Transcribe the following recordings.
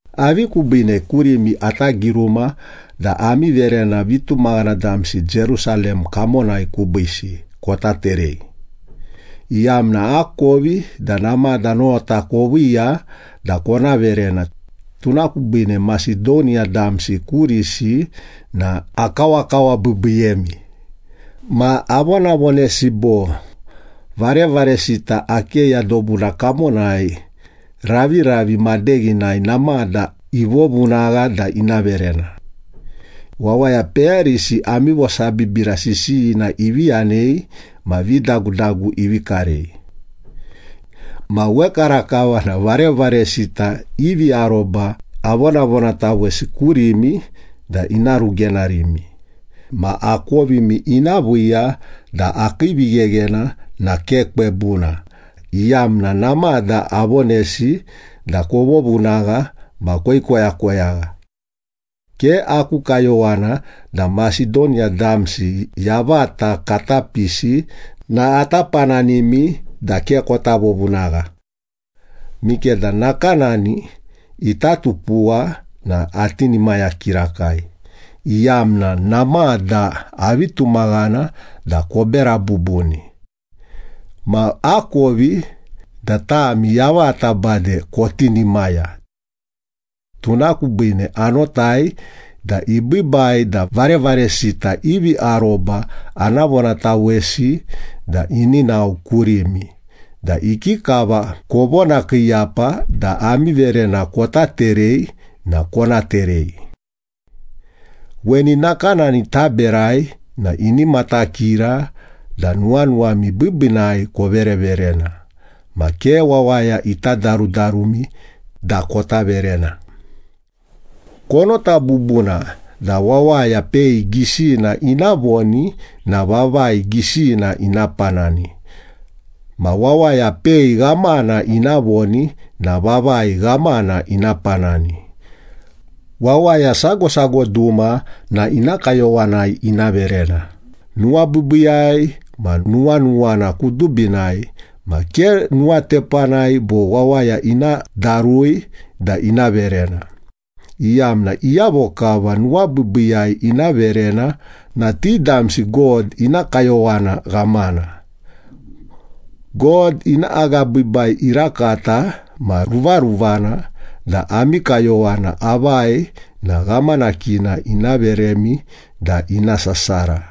Avi kubiine kurimi ata giruma da ami verena vitumaghana damsi Jerusalem kamonai kubiisi kota terei? Iyamna akovi da namada nota koviiya da kona verena, tuna kubiine Masedoniya damsi kurisi na akawakawabiibiiyemi, ma avonavonesi bo, “Varevaresita Akeya dobuna kamonai raviravi madeghinai namada ivovunagha da ina verena.” Wawaya peyarisi ami vosabibira sisiyina ivi yanei ma vidagudagu ivi karei. Ma wekarakava na varevaresita ivi aroba avonavonatawesi kurimi da ina rugenarimi ma akovimi ina viiya da akii vigheghena na ke kwebuna, iyamna namada avonesi da kovovunagha ma koikoyakoyagha. Ke aku kayowana da Masedoniya damsi yavata kata pisi na ata pananimi da ke kota vovunagha. Mikeda nakanani ita tupuwa na atinimaya kirakai, iyamna namada avi tumaghana da kobera bubuni. Ma akovi da tami yavata bade kotinimaya. Tuna kubiine anotai da ibiibai da varevaresita ivi aroba ana vonatawesi da ini nao kurimi da ikikava kovonakiiyapa da ami verena kota terei na kona terei. Weni nakanani taberai na ini matakira da nuwanuwami biibiinai kovereverena ma ke wawaya ita darudarumi da kota verena. Konota bubuna da wawaya pei gisina ina voni na vavai gisina ina panani, ma wawaya pei ghamana ina voni na vavai ghamana ina panani. Wawaya sago sago duma na ina kayowanai ina verena, nuwabiibiiyai ma nuwanuwana kudubinai, ma ke nuwatepanai bo wawaya ina darui da ina verena, iyamna iyavo kava nuwabiibiiyai ina verena na ti damsi God ina kayowana ghamana. God ina agabiibai irakata ma ruvaruvana da ami kayowana avai na ghamanakina ina veremi da ina sasara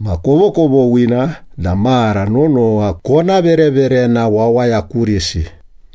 ma kovokovoghina da mara nonowa kona vereverena wawaya kurisi.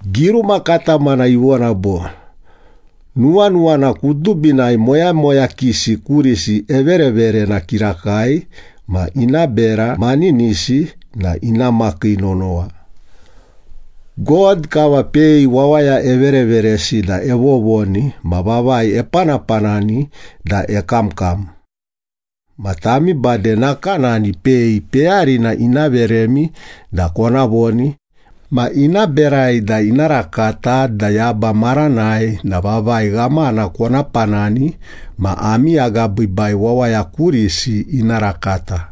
Giruma katamana ivona bo, “Nuwanuwana kudubinai moyamoyakisi kurisi evereverena kirakai, ma ina bera maninisi na ina makii nonowa.” God kava pei wawaya evereveresi da evovoni ma vavai epanapanani da ekamkam. Ma tami bade nakanani pei peyarina ina veremi da kona voni, ma ina berai da ina rakata da yaba maranai na vavai ghamana kona panani ma ami agabiibai wawaya kurisi ina rakata.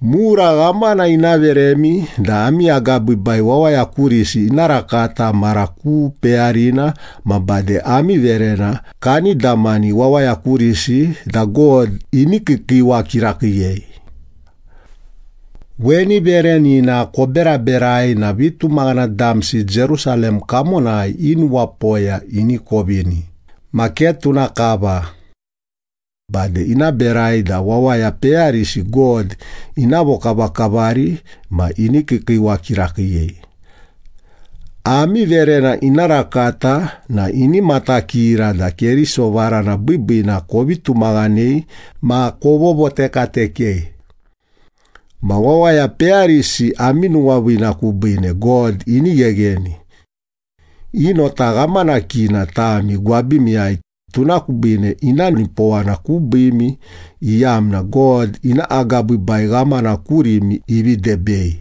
Mura ghamana ina veremi da ami agabiibai wawaya kurisi ina rakata mara ku peyarina ma bade ami verena kani damani wawaya kurisi da God ini kiikiiwa kirakiiyei. Weni verenina koberaberai na vitumaghana damsi Jerusalem kamonai i nuwapoya ini kovini ma ke tuna kava. Bade ina berai da wawaya peyarisi God ina vokavakavari ma ini kiikiiwa kirakiiyei. Ami verena ina rakata na ini matakira da Keriso varana biibiina kovi tumaghanei ma kovovotekatekei. Ma wawaya peyarisi ami nuwaviina kubiine God ini ghegheni. I nota ghamanakina tami gwabimiyai, tuna kubiine ina nipowana kubiimi, iyamna God ina agabiibai ghamana kurimi ivi debei.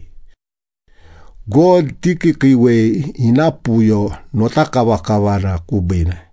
God tikiikiiwei ina puyo notakavakavana kubiine.